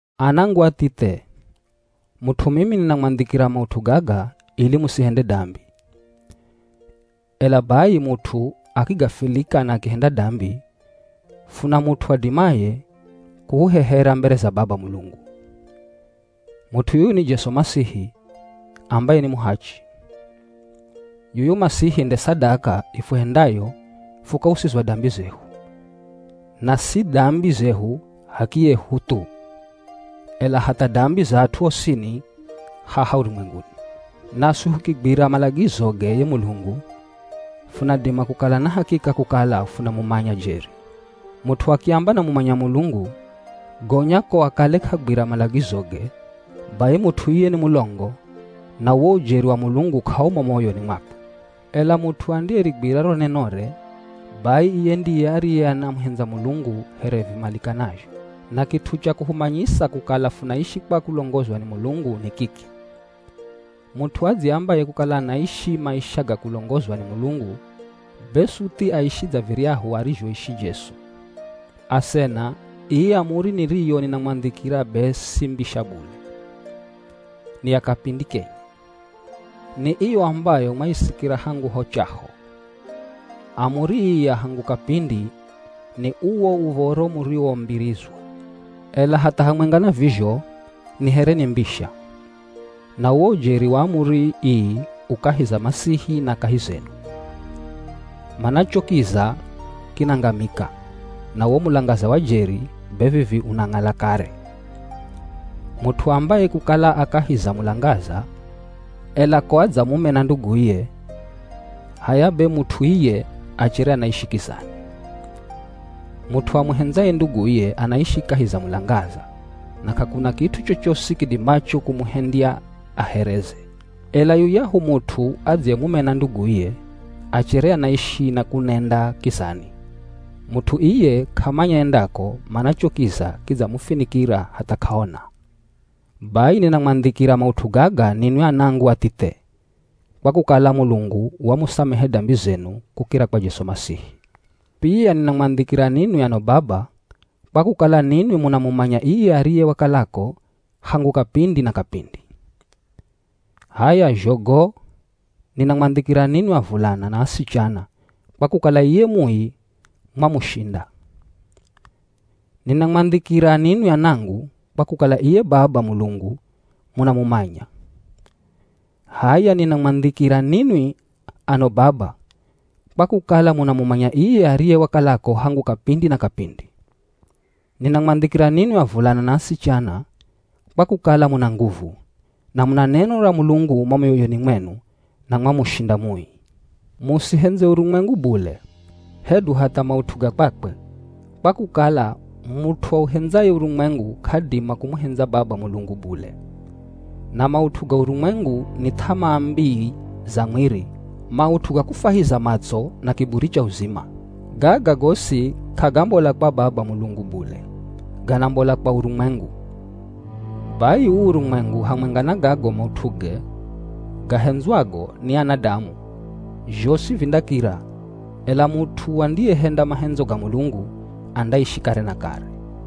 Anangu athithe, mut'u mimi ninamwandhikira maut'u gaga ili musihende dambi. Ela bai mut'u akigafilika na akihenda dambi, funa mut'u adimaye kuhuhehera mbere za Baba Mulungu. Mut'u yuyu ni Jesu Masihi, ambaye ni muhachi. Yuyu Masihi nde sadaka ifuhendayo fukausizwa dambi zehu, na si dambi zehu h'akiyehu thu, ela hatha dambi za at'u osini haha urumwenguni. Naswi fukigwira malagizoge ye Mulungu, funadima kukala na hakika kukala funamumanya jeri. Mut'u akiamba anamumanya Mulungu, gonya ko akale k'agwira malagizoge, bai mut'u iye ni mulongo, na uwo ujeri wa Mulungu k'aumo mo moyoni mwakwe. Ela mut'u andiyerigwira ro nenore, bai iye ndiye ariye anamuhendza Mulungu here vimalikanazho. Na kit'u cha kuhumanyisa kukala funaishi kwa kulongozwa ni Mulungu, ni kiki: Mut'u adziambaye kukala anaishi maisha ga kulongozwa ni Mulungu, be suthi aishi dza viryahu arizhoishi Jesu. Asena, ii amuri niriyo ninamwandhikira be si mbisha bule, ni ya kapindi kenye. Ni iyo ambayo mwaisikira hangu ho chaho. Amuri ii ya hangu kapindi, ni uwo Uv̱oro muriwombirizwa. Ela hatha hamwenga na vizho, ni here ni mbisha. Na uwo ujeri wa amuri ii u kahi za Masihi na kahi zenu. Mana cho kiza kinangamika, na uwo mulangaza wa jeri be vivi unang'ala kare. Mut'u aambaye kukala a kahi za mulangaza, ela ko adzamumena nduguye, h'aya be mut'u iye achere anaishi kizani. Mut'u amuhendzaye nduguye, anaishi kahi za mulangaza, na k'akuna kit'u chochosi kidimacho kumuhendya ahereze. Ela yuyahu mut'u adziyemumena nduguye, achere anaishi na kunenda kizani. Mut'u iye k'amanya endako, mana cho kiza kidzamufinikira hatha k'aona. Bai ninamwandhikira maut'u gaga ninwi anangu athithe, kwa kukala Mulungu wamusamehe dambi zenu kukira kwa Jesu Masihi. Pia ninamwandhikira ninwi ano baba, kwa kukala ninwi munamumanya iye ariye wakalako hangu kapindi na kapindi. H'aya zho go, ninamwandhikira ninwi avulana na asichana, kwa kukala iye Mui mwamushinda. Ninamwandhikira ninwi anangu, kwa kukala iye Baba Mulungu munamumanya. H'aya ninamwandhikira ninwi ano baba, kwa kukala munamumanya iye ariye wakalako hangu kapindi na kapindi. Ninamwandhikira ninwi avulana na asichana, kwa kukala muna nguvu, na muna neno ra Mulungu mo mioyoni mwenu na mwamushinda Mui. Musihendze urumwengu bule, hedu hatha maut'u ga kwakwe, kwa kukala mut'u auhendzaye urumwengu k'adima kumuhendza Baba Mulungu bule. Na maut'u ga urumwengu ni th'amaa mbii za mwiri, maut'u ga kufwahiza matso, na kiburi cha uzima. Gaga gosi k'agambola kwa Baba Mulungu bule, ganambola kwa urumwengu. Bai uu urumwengu hamwenga na gago maut'uge gahendzwago ni anadamu, zhosi vindakira, ela mut'u andiyehenda mahendzo ga Mulungu, andaishi kare na kare.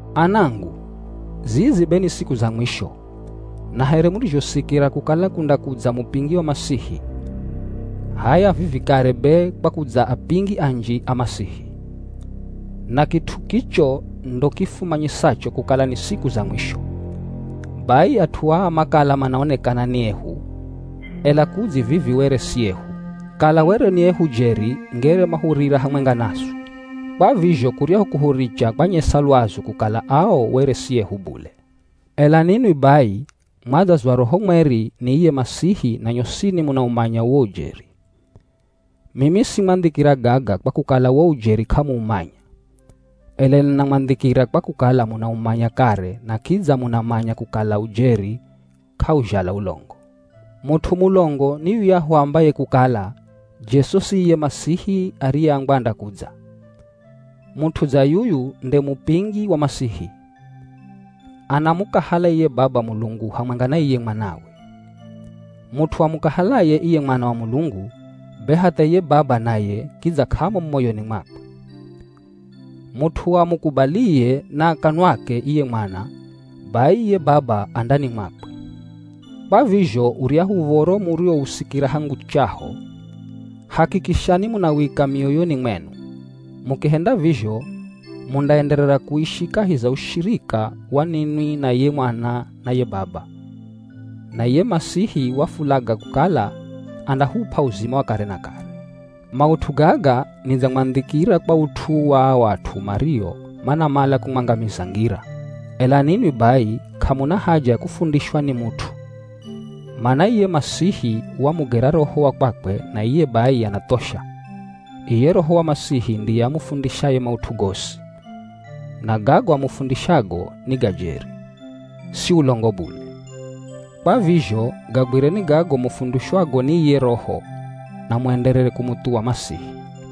Anangu, zizi be ni siku za mwisho, na here murizhosikira kukala kundakudza mupingi wa Masihi, h'aya vivi kare be kwakudza apingi anji a Masihi. Na kit'u kicho ndo kifumanyisacho kukala ni siku za mwisho. Bai at'u aa makala manaonekana ni ehu, ela kudzi vivi were si ehu, kala were ni ehu jeri ngere mahurira hamwenga naswi. Kwa vizho kuryahu kuhuricha kwanyesa lwazu kukala ao were si ehu bule. Ela ninwi bai, mwadzazwa Roho Mweri ni iye Masihi na nyosini munaumanya uwo ujeri. Mimi simwandhikira gaga, kwa kukala wo ujeri k'amuumanya, ela ninamwandhikira kwa kukala munaumanya kare na kidza munamanya kukala ujeri k'auzhala ulongo. Mut'u mulongo ni yuyahu aambaye kukala, Jesu si iye Masihi ariyeambwa andakudza. Mut'u dza yuyu nde mupingi wa Masihi. Anamukahala iye Baba Mulungu hamwenga na iye Mwanawe. Mut'u amukahalaye iye Mwana wa Mulungu, be hatha iye Baba naye kidza k'amo mo moyoni mwakwe. Mut'u amukubaliye na kanwake iye Mwana, bai iye Baba a ndani mwakwe. Kwa vizho uryahu uv̱oro muriwousikira hangu chaho, hakikishani munawika mioyoni mwenu. Mukihenda vizho, mundaenderera kuishi kahi za ushirika wa ninwi na ye Mwana na ye Baba. Na iye Masihi wafulaga kukala andahup'a uzima wa kare na kare. Maut'u gaga nidzamwandhikira kwa ut'u wa ao at'u mario manamala kumwangamiza ngira. Ela ninwi bai, k'amuna haja ya kufundishwa ni mut'u, mana iye Masihi wamugera Roho wa kwakwe na iye bai anathosha. Iye Roho wa Masihi ndiye amufundishaye maut'u gosi. Na gago amufundishago ni ga jeri, si ulongo bule. Kwa vizho gagwireni gago mufundishwago ni iye Roho na muenderere kumuthuwa Masihi.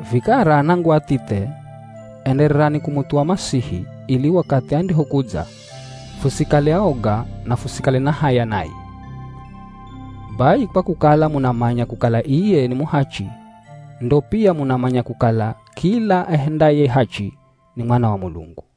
Vikara anangu athithe, endererani kumuthuwa Masihi, ili wakathi andihokudza, fusikale aoga na fusikale na haya naye. Bai kwa kukala munamanya kukala iye ni muhachi, ndo pia munamanya kukala kila ahendaye hachi ni mwana wa Mulungu.